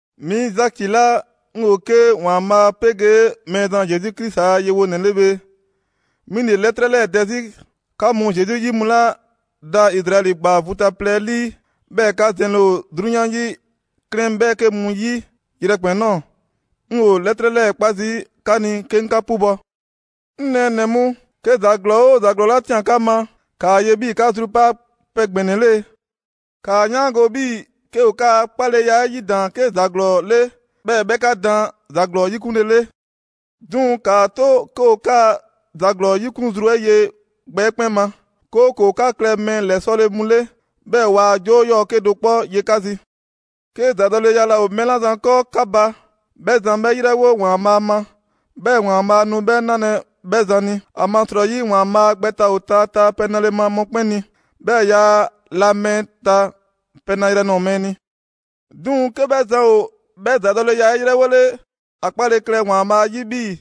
'Mi Zaki 'la 'ŋ 'yoo‑ 'ke ‑Waanbhaa' 'pegee Mɛɛzan Zesu Krisi a yewonɛ 'le bhe, 'mi ‑le 'lɛtrɛ 'lɛɛ‑ dɛ 'zi. 'Ka mu Zesu 'yi mu 'la ‑daa Izraɛli ‑gbaa vu ta plɛ 'ɛ 'lii, 'bhɛɛ‑ 'ka zɛnle ‑o 'drunyan 'yi 'klɛɛn 'bhɛɛke mu ‑yi yrɛkpɛn‑ ꞊nɔɔ, 'ŋ 'yoo‑ 'lɛtrɛ 'lɛɛ‑ 'kpa zii' 'ka ni 'ke 'ŋ 'ka 'pubɔ‑. 'Ŋ nɛɛnɛ‑ mu, 'ke ‑za ‑glɔɔ 'oo ‑za ‑glɔɔ 'la ꞊tian 'ka ma, ‑kaa ye 'bhii‑ 'ka zrukpaa' pɛ ‑gbɛnɛ ‑le. 'Kaa 'yaango‑ 'bhii‑ 'ke ‑o 'ka 'kpaleya 'ɛ 'yidaan‑ 'ke ‑za ‑glɔɔ 'le, 'bhɛɛ‑ 'bhɛ 'ka daan ‑za ‑glɔɔ 'yikunlele. 'Duŋ‑ ‑kaa 'to 'ke ‑o 'kaa‑ ‑za 'yikun zru 'ɛ ye gbɛ 'ɛ 'kpɛn ma, 'kooko‑ 'ka klɛ mɛɛ ‑lɛsɔle mu 'le, 'bhɛɛ‑ waa 'joo 'yɔɔ‑ 'kedo‑ 'kpɔ ye 'ka zi. 'Ke ‑zadɔleya laa ‑o mɛɛ 'la zan 'kɔɔ 'ka ba, 'bhɛ zan 'bhɛ 'yrɛwo ‑Waanbhaa' ma, 'bhɛɛ‑ ‑Waanbhaa' nu 'bhɛ 'nalɛ‑ 'bhɛ zan ni. ‑Amasrɔyi, ‑Waanbhaa' gbɛ ta ‑o taataa pɛ nale ma mɔkpɛn' ni, 'bhɛɛ‑ yaa la mɛɛ ta pɛ nayrɛ nɔɔ‑ mɛɛ ni. 'Duŋ‑, 'ke 'bhɛ zan ‑o 'bhɛ ‑zadɔleya 'ɛ 'yrɛwole, ‑a 'kpale‑ klɛ ‑Waanbhaa' 'yi 'bhii‑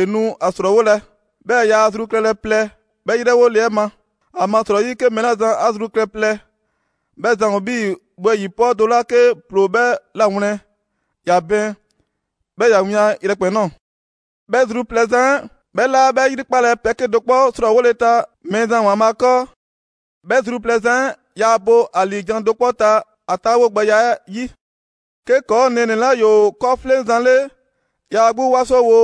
‑e nu a ‑srɔɔwolɛ, 'bhɛɛ‑ yaa ‑a zru klɛlɛ plɛ 'bhɛ 'yrɛwole 'ɛ ma. ‑Amasrɔyi 'ke mɛɛ 'la zan ‑a zru klɛ plɛ, 'bhɛ zan ‑o 'bhii‑ wɛyi‑ 'pɔɔ do 'la 'ke ‑ploo 'bhɛ 'lawlɛn‑, ‑ya bɛɛn, 'bhɛɛ‑ ‑ya wian yrɛkpɛn‑ ꞊nɔɔ. 'Bhɛ zru plɛ zan 'ɛ, 'bhɛ 'laa 'bhɛ ‑yrikpalɛ pɛ 'kedo‑ 'kpɔ 'srɔɔwole ta Mɛɛzan ‑Waanbhaa' 'kɔɔ. 'Bhɛ zru plɛ zan 'ɛ, yaa bo ‑a ‑liijan' do 'kpɔ ta ‑a 'taawogbɛya 'ɛ 'yi. 'Ke ‑kɔɔ' nɛɛnɛ‑ 'la ‑yoo 'kɔɔfleŋzan 'le, ‑ya 'gbu 'wasowo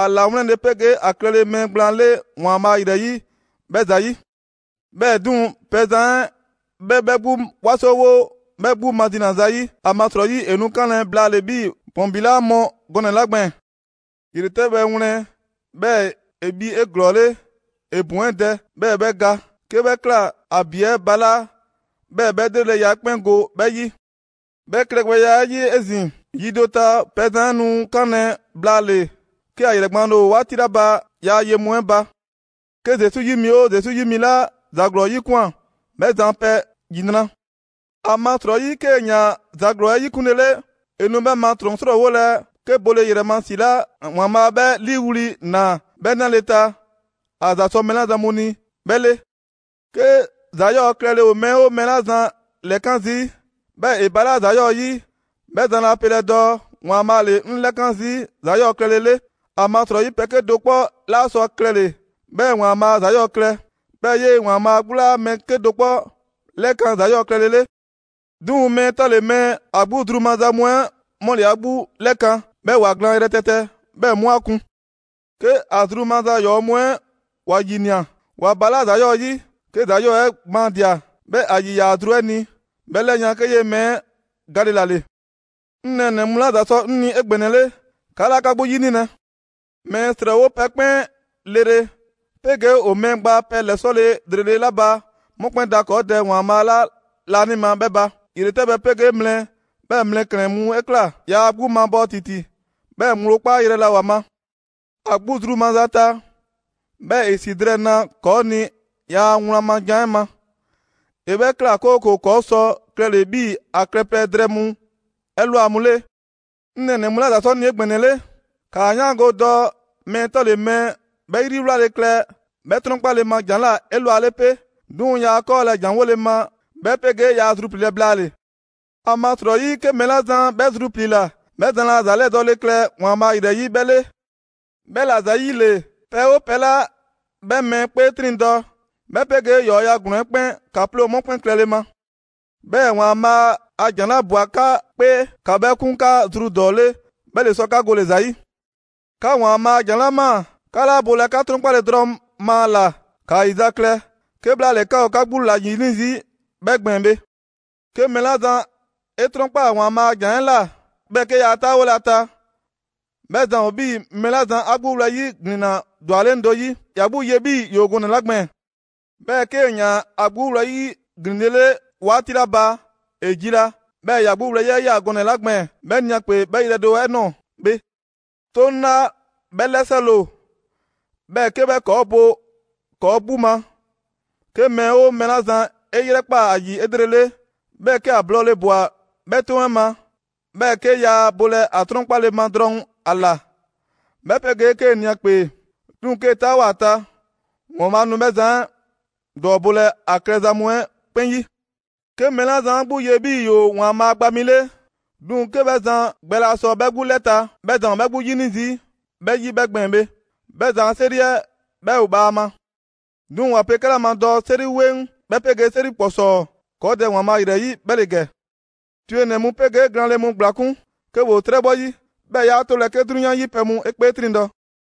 ‑a 'lawlɛnle 'pegee ‑a klɛle mɛɛ gblaan 'le ‑Waanbhaa' ‑yrɛ 'yi 'bhɛ ‑zayi'. 'Bhɛɛ‑ 'duŋ‑, pɛzan 'ɛ 'bhɛ 'bhɛ 'gbu 'wasowo 'bhɛ 'gbu mazina zayi'. ‑Amasrɔyi ‑e nu 'kanlɛ‑ blaale 'bhii‑ ‑bɔn ‑bi 'laa mɔ gɔnɛ‑ 'la gbɛɛn‑. ‑Yretɛbhɛ wlɛn, 'bhɛɛ‑ ‑e bhi 'eglɔɔle, ‑e ‑bɔn 'ɛ dɛ, 'bhɛɛ‑ 'bhɛ ga. 'Ke 'bhɛ ꞊kla, ‑a ‑bi 'ɛ balaa', 'bhɛɛ‑ 'bhɛ ‑lreleya 'ɛ 'kpɛn go 'bhɛ 'yi. 'Bhɛ klɛgbɛya 'ɛ 'yi 'ezin‑, yi do ta, pɛzan 'ɛ nu 'kanlɛ‑ blaale‑ 'ke ‑a ‑yrɛgbaanle ‑o 'waati 'la ba ‑yaa' ye mu 'ɛ ba. 'Ke Zesu 'yi mi 'oo Zesu 'yi mi 'la ‑za ‑glɔɔ 'yikwan꞊, 'bhɛ zan a pɛ ‑yinra'! ‑Amasrɔyi 'kee‑ ꞊yaan ‑za ‑glɔɔ 'ɛ 'yikunlele, ‑e nu 'bhɛ ma ‑trɔn 'srɔɔwolɛ 'ke bole ‑yrɛ ma ‑si 'la ‑Waanbhaa' 'bhɛ 'liiwli‑ ꞊naa 'bhɛ 'nale‑ ta ‑a ‑za sɔ mɛɛ 'la zan mu ni 'bhɛ 'le. 'Ke ‑za 'yɔɔ‑ klɛle ‑o mɛɛ 'oo mɛɛ 'la zan ‑lɛkan zii', 'bhɛɛ‑ ‑e ‑balaa' ‑za 'yɔɔ‑ 'yi, 'bhɛ zan laa pelɛ dɔɔ: «‑Waanbhaa' ‑le 'ŋ 'lɛkan zii' ‑za 'yɔɔ‑ klɛle 'le.» ‑Amasrɔyi pɛ 'kedo‑ 'kpɔ 'laa sɔ a klɛle‑ 'bhɛɛ‑ ‑Waanbhaa' ‑za 'yɔɔ‑ klɛ, 'bhɛɛ‑ 'yee‑ ‑Waanbhaa' 'gbu laa mɛɛ 'kedo‑ 'kpɔ 'lɛkan‑ ‑za 'yɔɔ‑ klɛlɛ 'le. 'Duŋ‑ mɛɛ 'tɔle‑ mɛɛ, ‑a 'gbu zru maza mu 'ɛ 'mu ‑le ‑a 'gbu 'lɛkan‑ 'bhɛɛ‑ ‑wa glaan yrɛtɛtɛ, 'bhɛɛ‑ 'mu 'a kun. 'Ke ‑a zru maza ‑yɔɔ' mu 'ɛ ‑wa ‑yinia, ‑wa ‑balaa' ‑za 'yɔɔ‑ 'yi. 'Ke ‑za 'yɔɔ‑ 'ɛ gbaandia‑, 'bhɛɛ‑ ‑a ‑yiyaa ‑a zru 'ɛ ni, 'bhɛ 'lɛyan‑ 'ke 'yee‑ mɛɛ 'ɛ gale ‑la ‑le. 'Ŋ nɛɛnɛ‑ mu 'la ‑za sɔ 'ŋ ni 'egbɛnɛle, 'ka 'laa 'ka 'gbu 'yinilɛ. Mɛɛ ‑srɔɔwo' pɛ 'kpɛn 'lrele‑ 'pegee ‑o mɛɛ gba pɛ ‑lɛsɔle ‑lrele' 'la ba 'mu 'kpɛn da ‑kɔɔ' Dɛ ‑Waanbhaa' 'la laanima 'bhɛɛ‑ ba. 'Yele‑ ‑yretɛbhɛ 'pegee mlɛ, 'bhɛɛ‑ mlɛklɛn‑ mu 'ɛ ꞊kla. Yaa ‑a 'gbu mabɔɔ ‑titi, 'bhɛɛ‑ ‑gblo 'kpayrɛ‑ laa ‑o ‑a ma. ‑A 'gbu zru maza ta, 'bhɛɛ‑ ‑e ‑si drɛɛ ‑naa ‑kɔɔ' ni ‑yaa' wlan ma jan 'ɛ ma. ‑E 'bhɛ ꞊kla, 'kooko‑ ‑kɔɔ' sɔ klɛle‑ 'bhii‑ ‑a klɛpɛ drɛɛ mu 'ɛ ‑lwa mu 'le. 'Ŋ nɛɛnɛ‑ mu 'la ‑za sɔ 'ŋ ni 'egbɛnɛle, ‑kaa 'yaango‑ dɔɔ mɛɛ 'tɔle‑ mɛɛ 'bhɛ 'yriwlale klɛ 'bhɛ 'trɔnkpale ma ‑jan ꞊la 'elwale 'pe, 'duŋ‑ yaa 'kɔɔlɛ‑ ‑janwole ma 'bhɛ 'pegee yaa a zrupliilɛ blaale‑. ‑Amasrɔyi 'ke mɛɛ 'la zan 'bhɛ zrupliila, 'bhɛ zan laa ‑za 'lɛdɔɔle klɛ ‑Waanbhaa' ‑yrɛ 'yi 'bhɛ 'le. 'Bhɛla‑ ‑zayile, pɛ 'oo pɛ 'la 'bhɛ mɛɛ 'kpee 'triŋdɔ‑, 'bhɛ 'pegee ‑yɔɔya' ‑glɔɔn 'ɛ 'kpɛn, ‑ka 'ploo 'mu 'kpɛn klɛle ma. 'Bhɛɛ‑ ‑Waanbhaa' a ‑jan 'la ꞊bwa 'ka 'kpee, ‑ka 'bhɛ 'kun 'ka zru ‑dɔɔ 'le, 'bhɛ ‑le sɔ 'ka gole‑ ‑za 'yi. 'Ka ‑Waanbhaa' a ‑jan 'la ꞊maa, 'ka 'laa bolɛ 'ka 'trɔnkpale drɔŋ ma ‑a ꞊la, ‑kaa ‑yizaklɛ; 'kebhlaale 'ka ‑o 'ka 'gbu ‑la 'yini zii' 'bhɛ gbɛɛn‑ bhe. 'Ke mɛɛ 'la zan 'e 'trɔnkpaa ‑Waanbhaa' a ‑jan 'ɛ ꞊la, 'bhɛɛ‑ 'ke yaa 'taawolɛ ‑a ta, 'bhɛ zan ‑o 'bhii‑ mɛɛ 'la zan ‑a 'gbu wlɛyi' ‑glinna ‑dwaleŋ' do 'yi, ‑ya 'gbu ye 'bhii‑ ‑yoo gɔnɛ‑ 'la gbɛɛn‑. 'Bhɛɛ‑ 'kee‑ 'yaan‑ ‑a 'gbu wlɛyi' ‑glinlele 'waati 'la ba, ‑e jila, 'bhɛɛ‑ ‑ya 'gbu wlɛyi' 'ɛ ꞊ya gɔnɛ‑ 'la gbɛɛn‑ 'bhɛ ni ‑a 'kpee 'bhɛ yrɛ do 'ɛ ꞊nɔɔ bhe. 'Toŋ 'la 'bhɛ 'lɛsɔle ‑o, 'bhɛɛ‑ 'ke 'bhɛ ‑kɔɔ' bo ‑kɔɔ' 'gbu ma, 'ke mɛɛ 'oo mɛɛ 'la zan 'e 'yrɛkpaa‑ ‑a ‑yi 'elrele, 'bhɛɛ‑ 'ke ‑a blɔɔle‑ ꞊bwa 'bhɛ 'toŋ 'ɛ ma, 'bhɛɛ‑ 'ke yaa bolɛ ‑a 'trɔnkpale ma drɔŋ ‑a ‑la, 'bhɛ 'pegee 'kee‑ ni ‑a 'kpee; 'duŋ‑ 'kee‑ 'taawoa꞊ ‑a ta, ‑Waanbhaa' nu 'bhɛ zan 'ɛ ‑dɔɔbolɛ ‑a klɛza mu 'ɛ 'kpɛn 'yi. 'Ke mɛɛ 'la zan 'a 'gbu ye 'bhii‑ ‑yoo ‑Waanbhaa' gba mi 'le, 'duŋ‑ 'ke 'bhɛ zan gbɛ laa sɔ 'bhɛ 'gbu 'lɛ ta, 'bhɛ zan ‑o 'bhɛ 'gbu 'yini zii' 'bhɛ 'yi 'bhɛ gbɛɛn‑ bhe. 'Bhɛ zan a 'seri 'ɛ 'bhɛ ‑o bhaama. 'Duŋ‑ ‑wa pe 'kɛla ma dɔɔ 'seri 'weŋ 'bhɛ 'pegee 'seri ‑kpɔsɔɔ ‑kɔɔ' Dɛ ‑Waanbhaa' ‑yrɛ 'yi 'bhɛ ‑le ‑gɛ: twenɛ‑ mu 'pegee glaanle mu ‑gblakun' 'ke ‑woo 'trɛbhɔ 'yi, 'bhɛɛ‑ 'yaa 'tolɛ‑ 'ke 'drunyan 'yi pɛ mu 'e 'kpee 'triŋdɔ‑.